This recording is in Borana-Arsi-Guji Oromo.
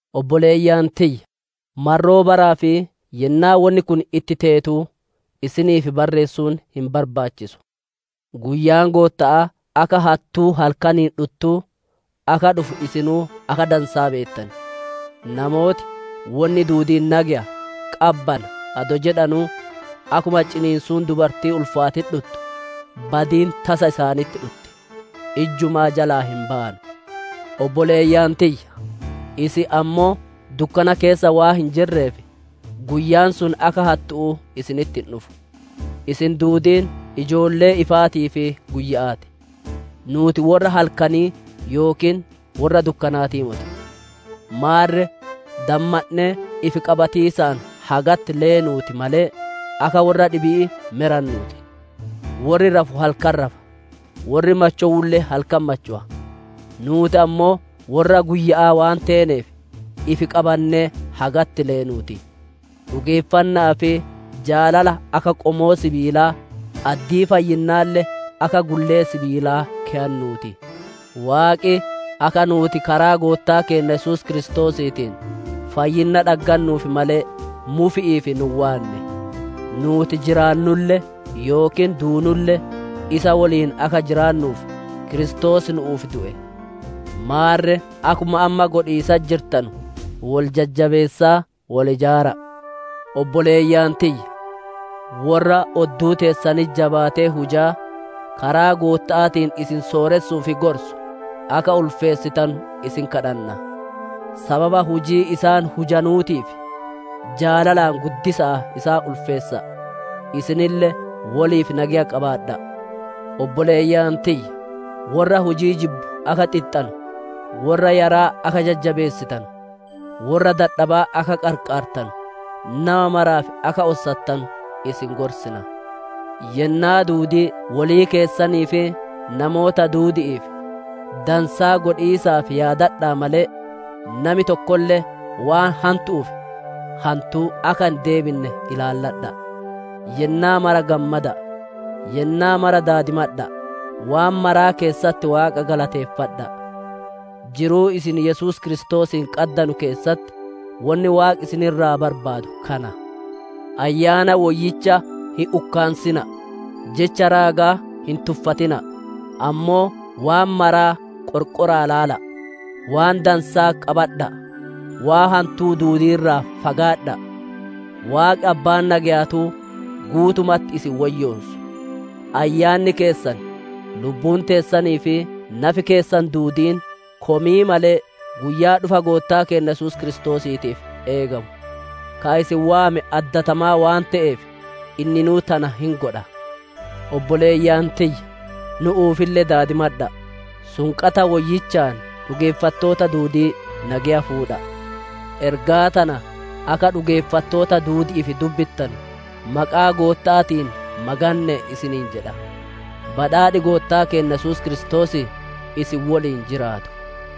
Obboleeyyan tiyya! Marroo baraa fi yennaa wonni kun itti teetuu isiniif barreessuun hin barbaachisu. Guyyaan Gootta'aa akka hattuu halkaniin dhuttuu akka dhufu isinuu akka dansaa beettan. Namooti, «Wonni duudiin nageya, qabbana» adoo jedhanuu, akkuma ciniinsuun dubartii ulfaatitti dhuttu, badiin tasa isaanitti dhutti; ijjumaa jalaa hin bayanu. Obboleeyyan tiyya! Isin ammoo dukkana keessa waan hin jirreef, guyyaan sun akka hattu'uu isinitti hin dhufu. Isin duudiin ijoollee ifaatii fi guyya'aa ti. Nuuti worra halkanii yookiin worra dukkanaatii moti. Maarre, dammandhee ifi qabatiisaan hagatti leenuutii malee, akka worra dhibi'ii me rannuu ti. Worri rafu halkan rafa; worri machowulle halkan machowa. Nuuti ammoo worra guyya'aa waan teeneef, ifi qabannee hagatti leenuu ti; dhugeeffanna'aa fi jaalala akka qomoo sibiilaa, addii fayyinnaalle akka gullee sibiilaa keyannuu ti. Waaqi akka nuuti karaa Goottaa keenna Yesuus Kiristoosiitiin fayyinna dhaggannuuf malee, mufi'iif nu hin waanne. Nuuti jiraannulle yookiin duunulle isa woliin akka jiraannuuf, Kiristoos nu'uuf du'e. Maarre akkuma amma godhiisatti jirtanu, wol jajjabeessaa wol ijaara'a. Obboleeyyan tiyya! Worra odduu teessanitti jabaatee hujaa, karaa Gootta'aatiin isin sooressuu fi gorsu akka ulfeessitanu isin kadhanna. Sababa hujii isaan hujanuutiif jaalalaan guddisa'aa isaan ulfeessa'a. Isinille woliif nageya qabaadha'a. Obboleeyyan tiyya! Worra hujii jibbu akka xixxanu, worra yaraa akka jajjabeessitanu, worra dadhabaa akka qarqaartanu, nama maraaf akka ossattanu isin gorsina. Yennaa duudii wolii keessanii fi namoota duudi'iif dansaa godhiisaaf yaadadha'a malee, nami tokkolle waan hantu'uuf hantuu akka hin deebinne ilaalladha'a. Yennaa mara gammada'a; yennaa mara daadimadha'a; waan maraa keessatti Waaqa galateeffadha'a. Jiruu isin Yesuus Kiristoosiin qaddanu keessatti wonni Waaqi isin irraa barbaadu kana. Ayyaana Woyyicha hin ukkaansina'a; jecha raagaa hin tuffatina'a; ammoo waan maraa qorqora'aa ilaala'a; waan dansaa qabadha'a; waan hantuu duudii irraa fagaadha'a. Waaqi Abbaan nageyaatuu, guutumatti isin woyyoonsu; ayyaanni keessan, lubbuun teessanii fi nafi keessan duudiin komii malee, guyyaa dhufa Goottaa keenna Yesuus Kiristoosiitiif eegamu. Ka isin waame addatamaa waan te'eef, inninuu tana hin godha. Obboleeyyan tiyya! Nu'uufille daadimadha'a. Sunqata woyyichaan dhugeeffattoota duudii nageya fuudha'a. Ergaa tana akka dhugeeffattoota duudi'iif dubbittanu maqaa Gootta'aatiin maganne'e isiniin jedha. Badhaadhi Goottaa keenna Yesuus Kiristoosii isin woliin jiraatu.